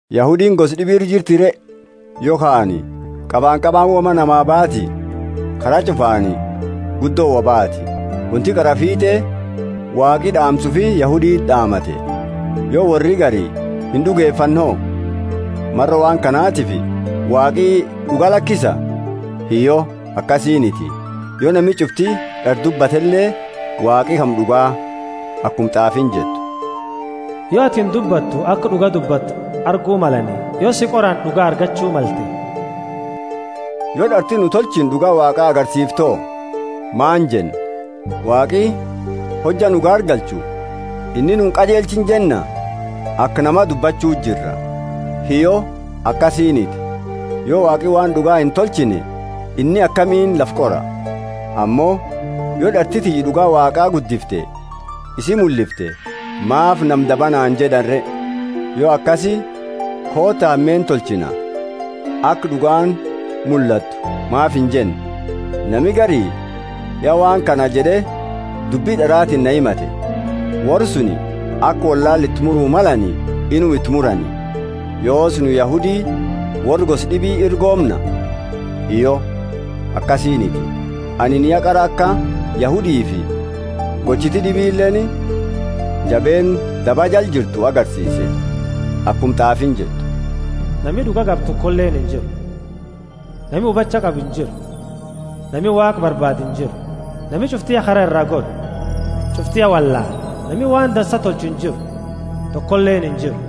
Yahudiini gosa d'ibi ira jirti re? Yokhaani qabanqabaani woma namaa baati? Kara ch'ufaani guddo wo baati! Wonti qaraa fiit'e Waaqi d'aamsa ufi Yahuditi d'aamate. Yo worri gari ind'ugefanne ho? Maro waan kanatifi Waaqi d'uga lakisa? Hiyyo, akasiiniti! Yo nami ch'ufti d'ara dubbatele, Waaqi kama d'ugaa. Akuma t'aafiini jettu: Yo atini dubbattu aka d'uga dubbattu argu malani, yo si qorani d'uga argachu malte. Yo d'arti nu tolchine d'uga Waaqa agarsiifte ho? Maani jenna? Waaqi, hojja nu gaargalchu, inni nu inqajelchine jenna? (Aka namaa dubbachu jira.) Hiyyo, akasiiniti. Yo Waaqi waan d'uga intolchine inni akamiini lafa qora? Ammo yo d'arti tiyya d'uga Waaqa guddifte isi mullifte, maafi nama daba naani jed'ani re? Yo akasi, Koota, hameenna tolchina, aka d'ugaani mullattu maafi injenne? Nami gari ya waan kana jed'e dubbi d'aratiini na himate! Worra suni aka wollaala iti muru malani inuma iti murani. Yoosi, nu Yahudi worra gosa d'ibi ira goomna? Hiyyo, akasiiniti! Anini ya qara aka Yahudifi gochiti d'ibileeni jabeenna daba jala jirtu agarsiise. Akuma t'aafiini jettu: Nami d'uga qabu tokoleeni injiru, nami hubacha qabu injiru, nami Waaqa barbaadu injiru. Nami ch'ufti ya kara iraa gore, ch'ufti ya wollaale. Nami waan dansa tolchu injiru, tokoleeni injiru.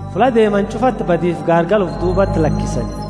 Fulla deemani ch'ufati badifi gaargala ufi duubati lakisani.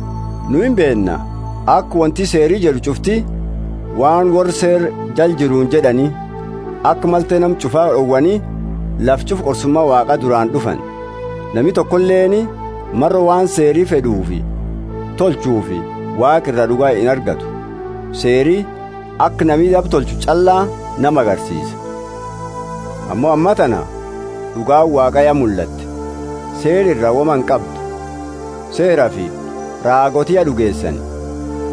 Nu imbeenna aka wonti Seeri jed'u ch'ufti waan worra Seera jala jiruuni jed'ani, aka malte nama ch'ufa d'owani lafa ch'ufaa qorsuma Waaqa duraani d'ufani. Nami tokoleeni maro waan Seeri fed'u tolchuufi Waaqa ira d'uga inargatu: Seeri aka nami daba tolchu ch'alla nama agarsiisa. Ammo ammatana d'ugaani Waaqa ya mullatte, Seera ira woma inqabdu. Seerafi raagooti ya d'ugeesani: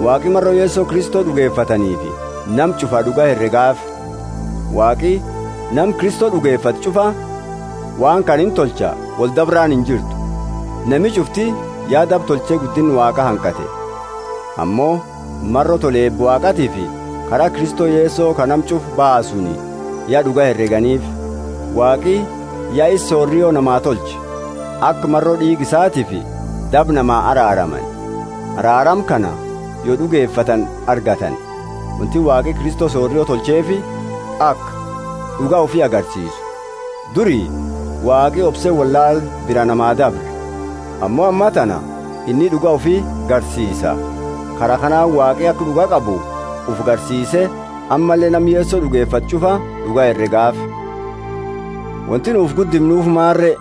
Waaqi maro Yeso Kristo d'ugefataniifi nama ch'ufa d'uga heregaafi. Waaqi nama Kristo d'ugefate ch'ufa waan kana intolcha woldabraani injirtu: nami ch'ufti ya daba tolche guddinna Waaqa hanqate. Ammo maro tola eeba Waaqaatiifi, kara Kristo Yeso ka nama ch'ufa baasuuni, ya d'uga hereganiifi. Waaqi ya isa sorio namaa tolche, aka maro d'iiga isatiifi daba namaa araaramani. Araarama kana yo d'ugefatani argatani. Wonti Waaqi Kristo sorio tolcheefi, aka d'uga ufi agarsiisu. Duri Waaqi obse wollaala bira namaa dabre; ammo ammatana inni d'uga ufi garsiisa. Kara kanaani Waaqi aka d'uga qabu ufi garsiise ammalle nama Yeso d'ugefatu ch'ufa d'uga heregaafi. Wonti nu ufi guddimnuufi maani re?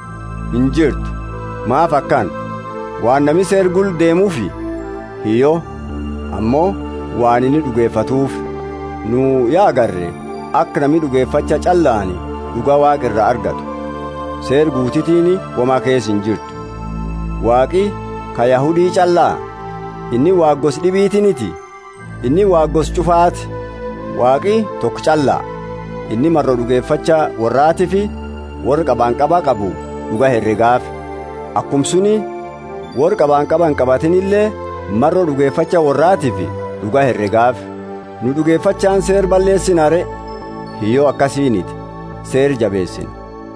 Injirtu! Maafi akana? Waan nami Seera gula deemuufi? Hiyyo, ammo waan inni d'ugefatuufi. Nu ya agarre aka nami d'ugefacha ch'allaani d'uga Waaqa iraa argatu, Seera guutitiini woma keesa injirtu. Waaqi ka Yahudi ch'alla? Inni Waaqa gosa d'ibitiniti? Inni Waaqa gosa ch'ufaati. Waaqi toko ch'alla; inni maro d'ugefacha worraatiifi worra qabanqaba qabu d'uga heregaafi, akuma suni worra qabanqaba inqabatinile maro d'ugefacha worraatiifi d'uga heregaafi. Nu d'ugefachaani Seera balleesina re? Hiyyo, akasiiniti! Seera jabeesina.